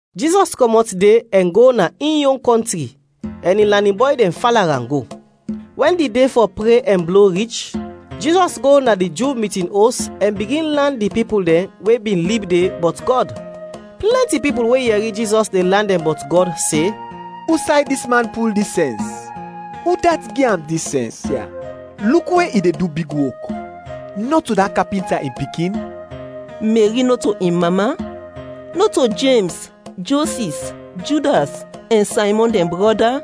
Jizɔs kɔmɔt de ɛn go na in yon kɔntri, ɛn in lanin bɔy dɛn fala am go. Wɛn di de fɔ pre ɛn blo rich, Jizɔs go na di Ju mitin os ɛn bigin lan di pipul dɛn we bin lib de bɔt Gɔd. Plɛnti pipul we yɛri Jizɔs de lan dɛn bɔt Gɔd, se “Usay dis man pul dis sɛns; udat gi am dis sɛns ya? Luk we i de du big wok! Nɔto da kapinta in pikin? Meri nɔto in mama? Nɔto Jems, Josis, Judas ɛn Saymɔn dɛn brɔda?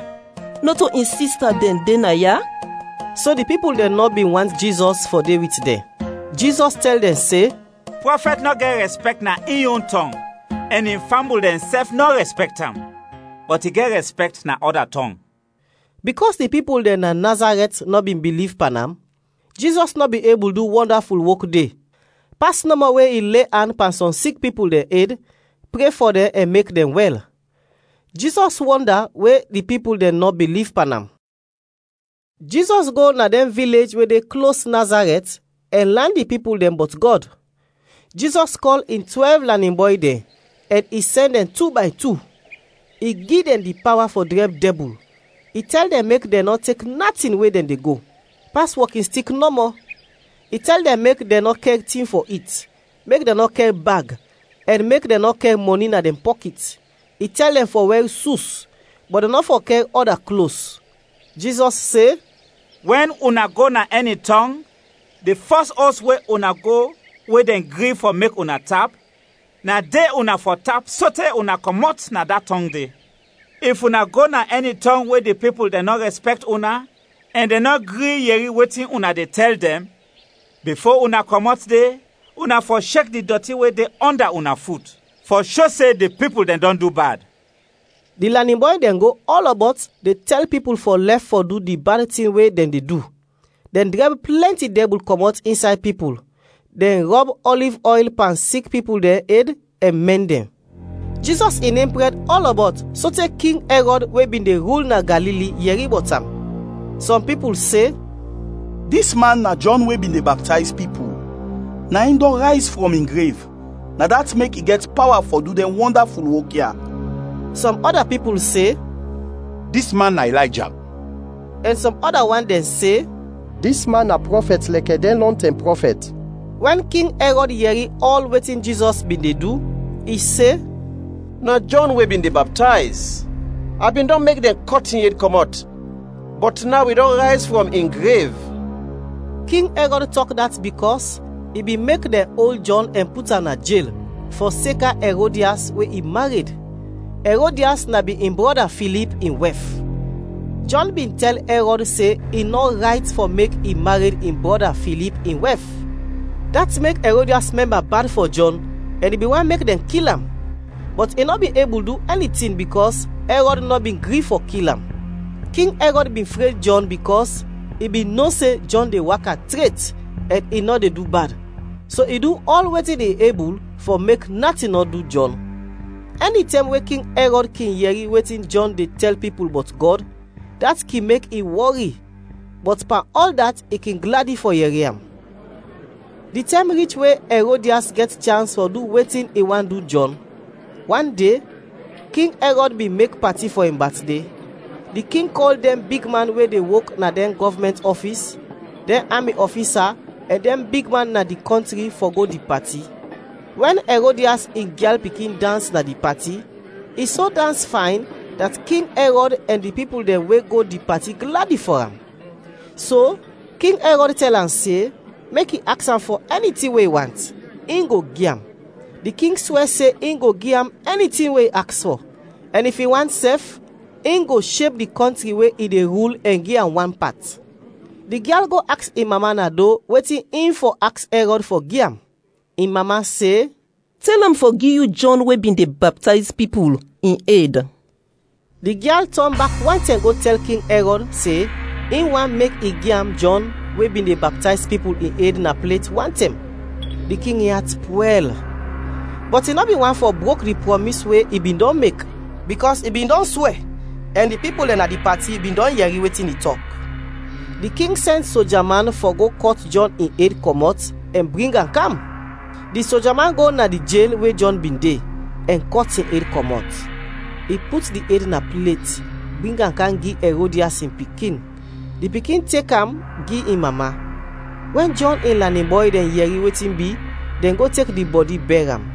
Nɔto in sista dɛn de naya?” So di pipul dɛn nɔ bin want Jizɔs fɔ de wit dɛn. Jizɔs tɛl dɛn se, “Prɔfɛt nɔ gɛt rɛspɛkt na in yon tɔng ɛn in fambul dɛnsɛf nɔ rɛspɛkt am, bɔt i gɛt rɛspɛkt na ɔda tɔng.” Bikɔs di pipul dɛn na Nazarɛt nɔ bin biliv pan am, Jizɔs nɔ bin ebul du wɔndaful wok de, pas nɔmɔ we i le an pan sɔm sik pipul dɛn ed, pre fɔ dɛn ɛn mek dɛn wɛl. Jizɔs wɔnda we di pipul dɛn nɔ biliv pan am. Jizɔs go na dɛn vilej we de klos Nazarɛt ɛn lan di pipul dɛn bɔt Gɔd. Jizɔs kɔl in twɛlv lanin bɔy dɛn ɛn i sɛn dɛn tu bay tu. I gi dɛn di pawa fɔ drɛb dɛbul. I tɛl dɛn mek dɛn nɔ tek natin we dɛn de go, pas wɔkinstik nɔmɔ; i tɛl dɛn mek dɛn nɔ kɛr tin fɔ it, mek dɛn nɔ kɛr bag, ɛn mek dɛn nɔ kɛr mɔni na dɛn pɔkit. I tɛl dɛn fɔ wɛr sus, bɔt dɛn nɔ fɔ kɛr ɔda klos. Jizɔs se, “Wɛn una go na ɛni tɔng, di fɔs os we una go we dɛn gri fɔ mek una tap, na de una fɔ tap sote una kɔmɔt na da tɔng de. If una go na ɛni tɔng we di pipul dɛn nɔ rɛspɛkt una ɛn dɛn nɔ gri yɛri wetin una de tɛl dɛn; bifo una kɔmɔt de, una fɔ shek di dɔti we de ɔnda una fut, fɔ sho se di pipul dɛn dɔn du bad.” Di lanin bɔy dɛn go ɔlɔbɔt de tɛl pipul fɔ lɛf fɔ du di bad tin dɛn we dɛn de du. Dɛn drɛb plɛnti dɛbul kɔmɔt insay pipul, dɛn rɔb ɔliv ɔyl pan sik pipul dɛn ed ɛn mɛn dɛn. Jizɔs in nem prɛd ɔlɔbɔt sote King Ɛrɔd we bin de rul na Galili yɛri bɔt am. Sɔm pipul se, “Dis man na Jɔn we bin de baptayz pipul, na in dɔn rayz frɔm in grev; na dat mek i gɛt pawa fɔ du dɛn wɔndaful wok ya.” Sɔm ɔda pipul se, “Dis man na Ilayja.” Ɛn sɔm ɔda wan dɛn se, “Dis man na prɔfɛt lɛkɛ dɛn lɔntɛm prɔfɛt.” Wɛn King Ɛrɔd yɛri ɔl wetin Jizɔs bin de du, i se, “Na Jɔn we bin de baptayz! A bin dɔn mek dɛn kɔt in ed kɔmɔt, bɔt naw i dɔn rayz frɔm in grev!” King Ɛrɔd tɔk dat bikɔs i bin mek dɛn ol Jɔn ɛn put am na jel, fɔseka Ɛrodias we i mared; Ɛrodias na bin in brɔda Filip in wɛf. Jɔn bin tɛl Ɛrɔd se i nɔ rayt fɔ mek i mared in brɔda Filip in wɛf. Dat mek Ɛrodias mɛmba bad fɔ Jɔn ɛn i bin want mek dɛn kil am, bɔt i nɔ bin ebul du ɛni tin bikɔs Ɛrɔd nɔ bin gri fɔ kil am. King Ɛrɔd bin fred Jɔn bikɔs i bin no se Jɔn de waka tret ɛn i nɔ de du bad, so i du ɔl wetin i ebul fɔ mek natin nɔ du Jɔn. Ɛnitɛm we King Ɛrɔd kin yɛri wetin Jɔn de tɛl pipul bɔt Gɔd, dat kin mek i wɔri, bɔt pan ɔl dat i kin gladi fɔ yɛri am. Di tɛm rich we Ɛrodias gɛt chans fɔ du wetin i want du Jɔn. Wan de, King Ɛrɔd bin mek pati fɔ in batde. Di king kɔl dɛn bigman we de wok na dɛn gɔvmɛnt ɔfis, dɛn ami ɔfisa ɛn dɛn bigman na di kɔntri fɔ go di pati. Wɛn Ɛrodias in gyal pikin dans na di pati, i so dans fayn dat King Ɛrɔd ɛn di pipul dɛn we go di pati gladi fɔ am. So King Ɛrɔd tɛl am se, mek i aks am fɔ ɛni tin we i want, in go gi am. Di king swɛ se in go gi am ɛni tin we i aks fɔ, ɛn if i want sɛf, in go sheb di kɔntri we i de rul ɛn gi am wan pat. Di gyal go aks in mama na do wetin in fɔ aks Ɛrɔd fɔ gi am. In mama se, “Tɛl am fɔ gi yu Jɔn we bin de baptayz pipul, in ed.” Di gyal tɔn bak wantɛm go tɛl King Ɛrɔd se in want mek i gi am Jɔn we bin de baptayz pipul, in ed na plet wantɛm. Di king in at pwɛl, bɔt i nɔ bin want fɔ brok di prɔmis we i bin dɔn mek, bikɔs i bin dɔn swɛ ɛn di pipul dɛn na di pati bin dɔn yɛri wetin i tɔk. Di king sɛn soja man fɔ go kɔt Jɔn in ed kɔmɔt ɛn bring am kam. Di soja man go na di jel we Jɔn bin de, ɛn kɔt in ed kɔmɔt. I put di ed na plet, bring am kam gi Ɛrodias in pikin; di pikin tek am gi in mama. Wɛn Jɔn in lanin bɔy dɛn yɛri wetin bi, dɛn go tek di bɔdi bɛr am.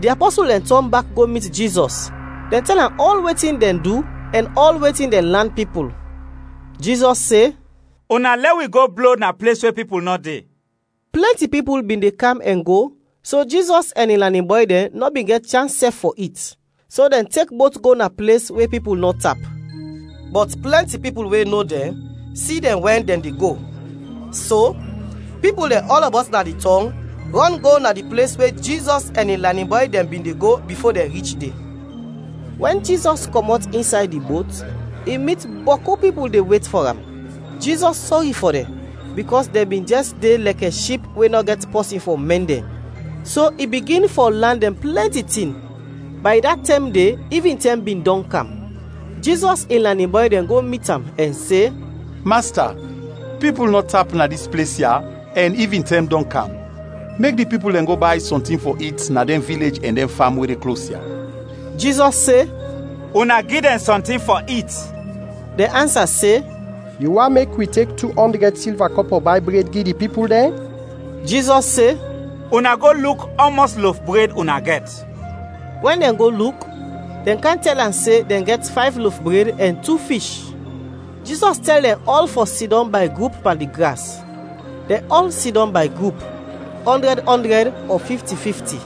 Di apɔsul dɛn tɔn bak go mit Jizɔs; dɛn tɛl am ɔl wetin dɛn du ɛn ɔl wetin dɛn lan pipul. Jizɔs se, “Una lɛ wi go blo na ples we pipul nɔ de.” Plɛnti pipul bin de kam ɛn go so Jizɔs ɛn in lanin bɔy dɛn nɔ bin gɛt chans sɛf fɔ it. So dɛn tek bot go na ples we pipul nɔ tap. Bɔt plɛnti pipul we no dɛn, si dɛn wɛn dɛn de go, so pipul dɛn ɔlɔbɔt na di tɔng rɔn go na di ples we Jizɔs ɛn in lanin bɔy dɛn bin de go bifo dɛn rich de. Wɛn Jizɔs kɔmɔt insay di bot, i mit bɔku pipul de wet fɔ am; Jizɔs sɔri fɔ dɛn, bikɔs dɛn bin jɛs de lɛkɛ ship we nɔ gɛt pɔsin fɔ mɛn dɛn, so i bigin fɔ lan dɛn plɛnti tin. Bay da tɛm de ivintɛm bin dɔn kam, Jizɔs in lanin bɔy dɛn go mit am ɛn se, “Masta, pipul nɔ tap na dis ples ya ɛn ivintɛm dɔn kam; mek di pipul dɛn go bay sɔntin fɔ it na dɛn vilej ɛn dɛn fam we de klos ya.” Jizɔs se, “Una gi dɛn sɔntin fɔ it.” Dɛn ansa se, “Yu want mek wi tek tu ɔndrɛd silva kɔpɔ bay bred gi di pipul dɛn?” Jizɔs se, “Una go luk ɔmɔs lof bred una gɛt.” Wɛn dɛn go luk, dɛn kam tɛl am se dɛn gɛt fayv lof bred ɛn tu fish. Jizɔs tɛl dɛn ɔl fɔ sidɔm bay grup pan di gras. Dɛn ɔl sidɔm bay grup: ɔndrɛd-ɔndrɛd ɔ fifti-fifti.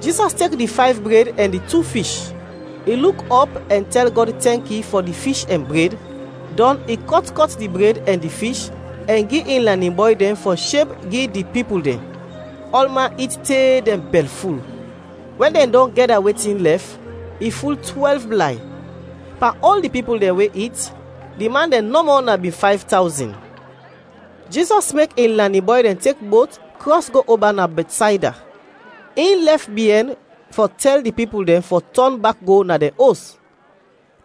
Jizɔs tek di fayv bred ɛn di tu fish, i luk ɔp ɛn tɛl Gɔd tɛnki fɔ di fish ɛn bred, dɔn i kɔt kɔt di bred ɛn di fish ɛn gi in lanin bɔy dɛn fɔ sheb gi di pipul dɛn. Ɔlman it te dɛn bɛlful. Wɛn dɛn dɔn gɛda wetin lɛf, i ful twɛlv blay. Pan ɔl di pipul dɛn we it, di man dɛn nɔmɔ na bin fayv tawzin. Jizɔs mek in lanin bɔy dɛn tek bot krɔs go oba na Bɛtsayda, in lɛf biɛn fɔ tɛl di pipul dɛn fɔ tɔn bak go na dɛn os.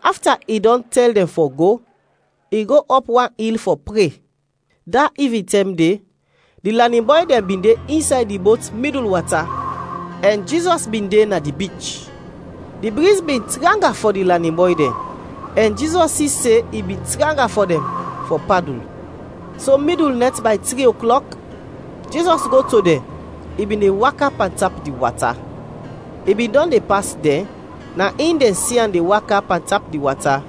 Afta i dɔn tɛl dɛn fɔ go, i go ɔp wan il fɔ pre. Da ivintɛm de, di lanin bɔy dɛn bin de insay di bot midul wata ɛn Jizɔs bin de na di bich. Di briz bin tranga fɔ di lanin bɔy dɛn, ɛn Jizɔs si se i bin tranga fɔ dɛn fɔ padul. So midul nɛt bay tri oklɔk, Jizɔs go to dɛn, i bin de waka pantap di wata. I bin dɔn de pas dɛn, na in dɛn si am de waka pantap di wata,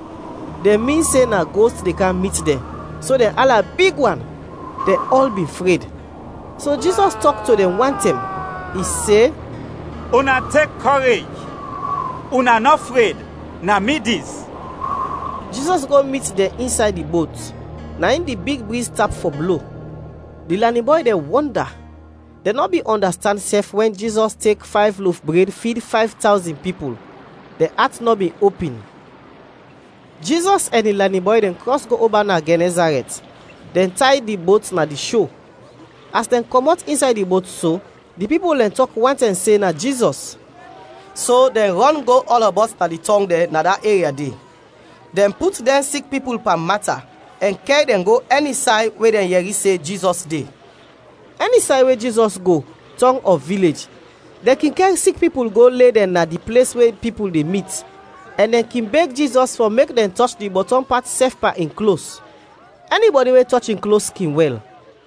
dɛn min se na gost de kam mit dɛn, so dɛn ala big wan! Dɛn ɔl bin fred. So Jizɔs tɔk to dɛn wantɛm. I se, “Una tek kɔrej, una nɔ fred, na mi dis!” Jizɔs go mit dɛn insay di bot, na in di big briz tap fɔ blo. Di lanin bɔy dɛn wɔnda. Dɛn nɔ bin ɔndastand sɛf wɛn Jizɔs tek fayv lof bred fid fayv tawzin pipul. Dɛn at nɔ bin opin. Jizɔs ɛn in lanin bɔy dɛn krɔs go oba na Gɛnɛzarɛt, dɛn tay di bot na di sho. As dɛn kɔmɔt insay di bot so, di pipul dɛn tɔk wantɛm se na Jizɔs. So dɛn rɔn go ɔlɔbɔt na di tɔng dɛn na da eria de, dɛn put dɛn sik pipul pan mata ɛn kɛr dɛn go ɛni say we dɛn yɛri se Jizɔs de. Ɛni say we Jizɔs go, tɔng ɔ vilej, dɛn kin kɛr sik pipul go le dɛn na di ples we pipul de mit, ɛn dɛn kin beg Jizɔs fɔ mek dɛn tɔch di bɔtɔm pat sɛf pan in klos; ɛnibɔdi we tɔch in klos, kin wɛl.